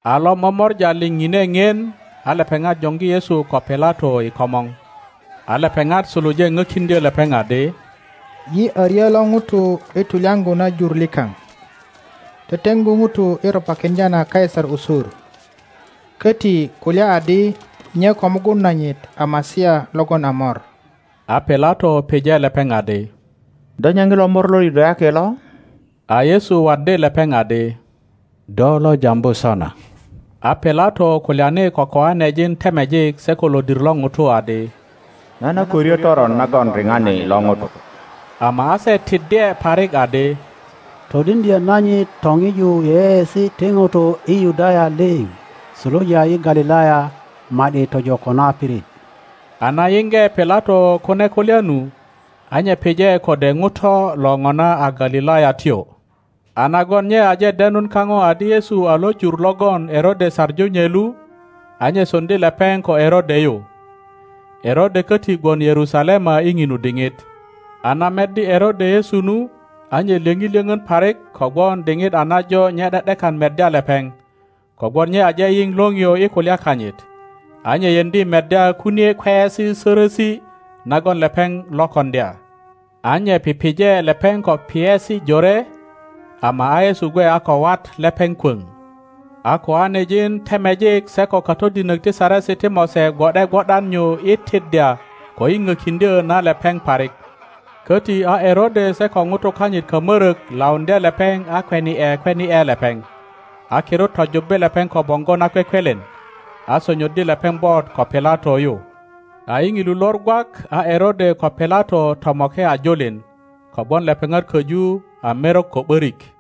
A lo momora liŋ ŋine ŋien, a lepeŋat joŋgi Yesu ko Pilato i komor. a lepeŋat suluje pökiŋdyö lepeŋ adi, Yi a ryö lo ŋuto i tulyaŋgu na jur likaŋ, teteŋgu ŋutu i ropakiŋdya na Kaisar usur, köti kulya adi nye ko mugun nanyit a Masia logon a mor. A Pilato pije lepeŋ adi, Do nye ŋilo Mor lo Yudayaki lo? A Yesu waddi lepeŋ adi, Do lo jambu sona. A Pilato kulyani ko koanejin temejik se ko lodir lo ŋutu adi, Nan a ko ryö toron nagon riŋari lo ŋuto. Ama a se tiddye parik adi, Todiŋdyö nanyit toŋiju yeyeesi ti ŋutu i Yudaya liŋ, suluja i Galilaya ma ’di tojo ko na pirit. A na yiŋge Pilato kune kulya nu, a nye pije kode ŋuto lo ŋona a Galilayatyo, a nagon nye aje denun kaŋo adi Yesu a lo jur logon Erode saŋu nye lu, a nye soŋdi lepeŋ ko Erode yu. Erode köti gwon Yerusalema i ŋinu diŋit. A na meddi Erode Yesu nu, a nye lyöŋi lyöŋön parik kogwon diŋit a najo nye ’de ’dekan meddya lepeŋ, kogwon nye aje yiŋ liŋio i kulya kanyit, a nye yeŋdi meddya kunie kweyesi sörösi nagon lepeŋ lo koŋdya. a nye pije lepeŋ ko piyesi jore, ama a Yesu gwe a ko wat lepeŋ kwöŋ. a koanejin temejik se ko katodinök ti Saresi ti Mose gwo ’de gwo ’dan nyu i tiddya ko i pökiŋdyö na lepeŋ parik. Köti a Erode se ko ŋutu kanyit kamörök lauŋdye lepeŋ a kweni ’e kweni ’e lepeŋ, a kirut tojubbi lepeŋ ko boŋgo nakwekwelen, a sonyoddi lepeŋ bot ko Pilato yu. A i ŋilu lor gwak a Erode ko Pilato tomoke a julin, kogwon lepeŋat köju a merok ko ’börik.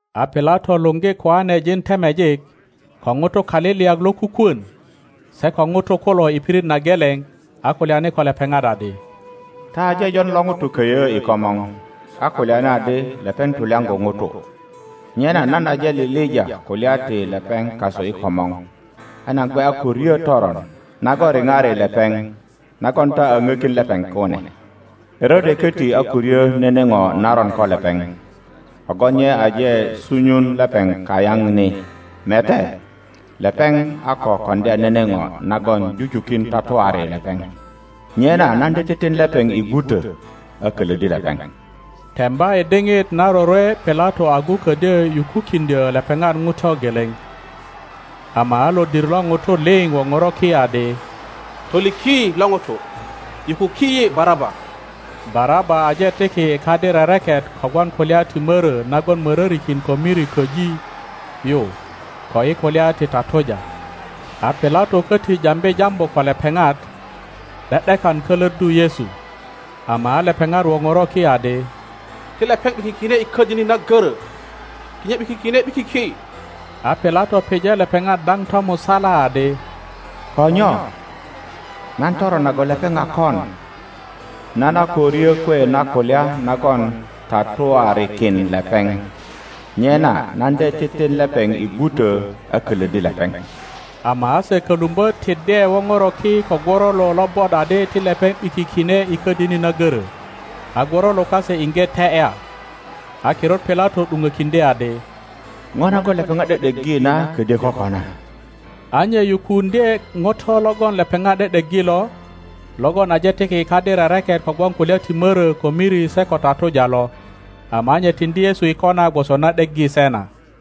A Pilato luŋgi koanejin temejik, ko ŋutu kaliliyak lokukwön, se ko ŋutu kulo i pirit na geleŋ, a kulyani ko lepeŋat adi, Ta aje jon lo ŋuto köyö i komor, a kulyani adi lepeŋ tulyaŋgu ŋutu. Nyena nan aje lilija kulya ti lepeŋ kasu i komor, a nan gwe a ko ryö toron nagon riŋari lepeŋ, nagon ta a ŋökin lepeŋ kune. Erode koti a ko ryö nene ŋo naron ko lepeŋ, kogwon nye aje sunyun lepeŋ kayaŋ ni. Mete, lepeŋ a ko koŋdya nene ŋo nagon jujukin tatuari lepeŋ. Nyena nan de titin lepeŋ i gwutö, a kölöddi lepeŋ. [ Temba i diŋit na rorwe Pilato agu ködyö pukukiŋdyö lepeŋat ŋuto geleŋ.] Ama a lodir lo ŋutu liŋ woŋoro ki adi, Toliki lo ŋuto, yukuki yi Baraba. (Baraba aje tiki i kadi rereket kogwon kulya ti mörö nagon mörörikin ko miri köji yu ko i kulya ti tatuja.) a Pilato köti jambi jambu ko lepeŋat, ’de ’dekan kölöddu Yesu; ama a lepeŋat woŋoro ki adi, Ti lepeŋ ’bikikine i ködini na görö! Ti nye ’bikikine ’bikiki! A Pilato pije lepeŋat daŋ tomusala adi, Ko nyo? Nan toron nagon lepeŋ a kon? Nan a ko ryö kwe na kulya nagon tatuarikin lepeŋ. Nyena nan de titin lepeŋ i gwuto, a kölöddi lepeŋ. Ama a se kölumbö tiddye woŋoro ki ko gworolo lobot adi ti lepeŋ ’bikikine i ködini na görö, a gworolo kase iŋge te ’ya. a kirut Pilato ’duŋökiŋdye adi, ŋo nagon lepeŋat ’de ’deggi na ködyö kokona. A nye yukuuŋdye ŋuto logon lepeŋat ’de ’deggi lo, logon aje tiki i kadi rereket kogwon kulya ti mörö ko miri se ko tatuja lo, ama a nye tiŋdi Yesu i kona gwoso na ’deggi se na.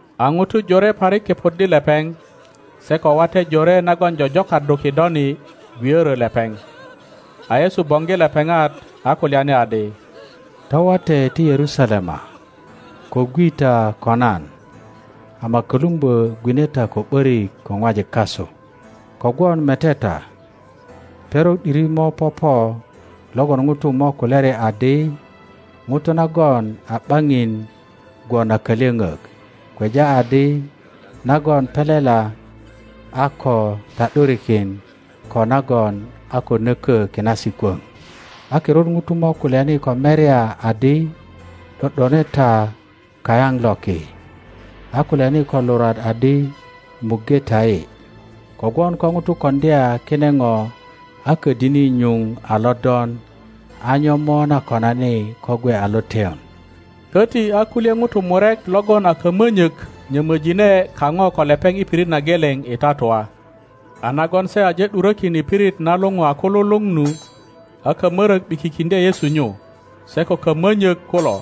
A ŋutu jore parik kepoddi lepeŋ, se ko wate jore nagon jojokaddu kidoni, gwiorö lepeŋ. A Yesu boŋgi lepeŋat, a kulyani adi, Ta wate ti Yerusalema, ko gwi ta ko nan, ama kölumbö gwine ta ko ’börik ko ŋwajik kasu. Kogwon mete ta, perok ’diri mo popo logon ŋutu mo kulyari adi, Ŋutu nagon a ’baŋin gwon a kalyoŋök, kweja adi nagon pelela a ko ta ’durikin ko nagon a ko nökö kinasi kwoŋ. A kirut ŋutu mo kulyani ko merya adi, ’Do ’done ta kayaŋ loki, a kulyani ko lurwat adi, Muŋge ta yi. Kogwon ko ŋutu koŋdya kine ŋo a ködini nyuŋ a lodon, a nyo mo na konani ko gwe a loteyon? Köti a kulye ŋutu murek logon a kamönyök nyömöjine kaŋo ko lepeŋ i pirit na geleŋ i tatua. A nagon se aje ’durökin i pirit na luŋu a Kululuŋ nu, a kamörök ’bikikiŋdye Yesu nyu, se ko kamönyök kulo,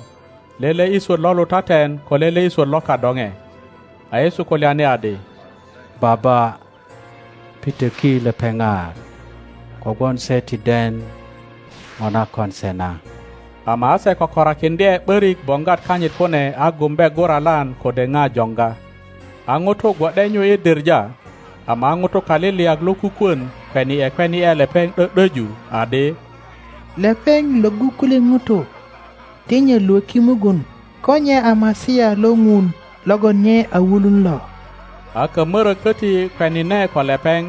lele i swöt lo lutaten ko lele i swöt lo kadoŋe. a Yesu kulyani adi, Baba, pitöki lepeŋat, kogwon se ti den ŋo na kon se na. Ama a se kökorakiŋdye ’börik boŋgwat kanyit kune a gumbe guralan kode ŋa joŋga. a ŋutu gwo ’de nyu i diŋa; ama a ŋutu kaliliyak lokukwön kweni ’e kweni ’e lepeŋ ’dö ’döju, adi, Lepeŋ lwöggu kulye ŋutu; ti nye lwöki mugun, ko nye a Masia lo Ŋun logon nye a wulun lo! akamörök köti kwenine ko lepeŋ,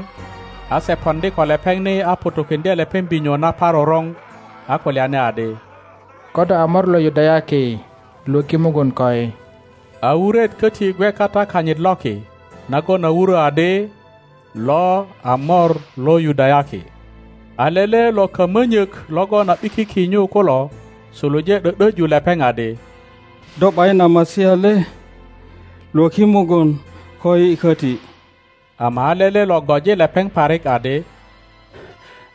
a se poŋdi ko lepeŋ ni a ŋutukiŋdye lepeŋ binyo naparoroŋ, a kulyani adi, Ko do a Mor lo Yudayaki, lwöki mugun koi! A wuret köti gwe kata kanyit loki, nagon a wurö adi, LO A MOR LO YUDAYAKI. A lele lo kamönyök logon a ’bikiki nyu kulo, suluje ’dö ’döju lepeŋ adi, Do ’bayin a Masia le? Lwöki mugun koyi köti! Ama a lele lo goji lepeŋ parik adi,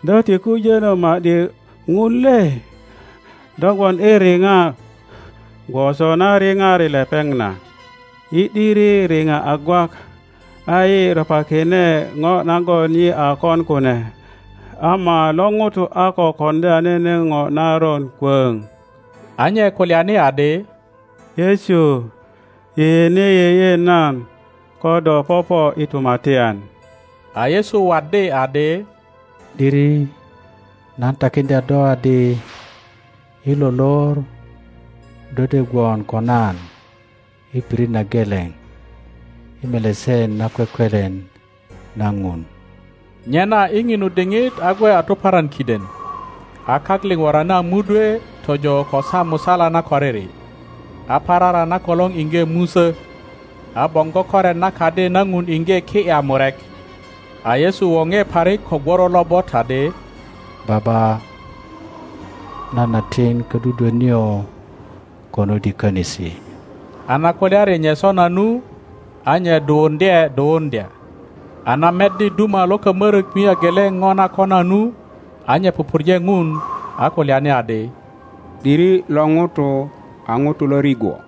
Do ti kujönö ma ’di Ŋun le? Do gwon i riŋa gwoso na riŋari lepeŋ na. Yi ’diri riŋa a gwak, a yi ropakine ŋo nagon yi a kon kune; ama lo ŋuto a ko koŋdya nene ŋo naron kwöŋ. a nye kulyani adi, Yesu, yeyene yeye nan ko do popo i tumatyan. a Yesu waddi adi, ’Diri nan takiŋdya do adi, i lo lor do de gwon ko nan i pirit na geleŋ i Melesen nakwekwelen na Ŋun. Nyena i ŋinu diŋit a gwe a tuparan kiden. A kak liŋ worani a mudwe tojo ko saa musala na koriri, a parara na kolor iŋge musö; a boŋgo koret na Kadi na Ŋun iŋge ki ’ya murek. a Yesu woŋe parik ko gworo lobot adi, Baba, nan a tin ködudwö nio konut i könisi; a na kulyari nye sona nu, a nye duwuŋdye duwuŋdya. a na meddi duma lo kamörök mia geleŋ ŋo na kona nu, a nye pupurje Ŋun, a kulyani adi, ’Diri lo ŋuto a ŋuto lo rigwo.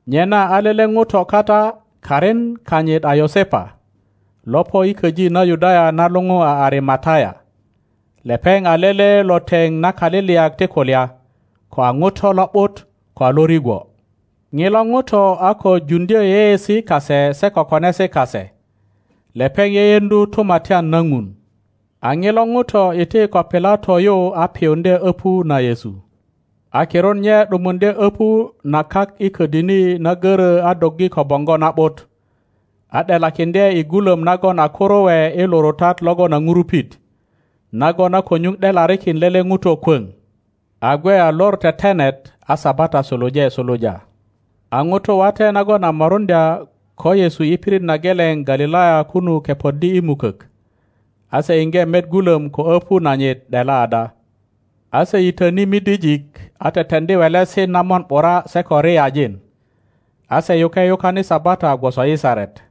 Nyena a lele ŋuto kata, karin kanyit a Yosepa, lo po i köji na Yudaya na luŋu a Arimataya. Lepeŋ a lele lo teŋ na kaliliyak ti kulya, ko a ŋuto lo ’but ko a lo rigwo. Ŋilo ŋuto a ko juŋdyö yeyeesi kase se ko konesi kase. Lepeŋ yeyeŋdu Tumatyan na Ŋun. A ŋilo ŋuto iti ko Pilato yu a piyuŋdye öpu na Yesu. A kirut nye ’dumuŋdye öpu na kak i ködini na görö a doggi ko boŋgo na ’but, a ’delakiŋdye i gulöm nagon a kuruwe i lurutat logon a ŋurupit, nagon a ko nyuŋ ’delarikin lele ŋuto kwoŋ. A gwe a Lor Tetenet a Sabata suluje suluja. a ŋutu wate nagon a moruŋdya ko Yesu i pirit na geleŋ Galilaya kunu kepoddi i mukök, a se iŋge met gulom ko öpu nanyit ’dela ada. A se yitöni midijik a teteŋdi welesi na mon ’bura se ko riyajin. A se yuke yukan i Sabata gwoso i saret.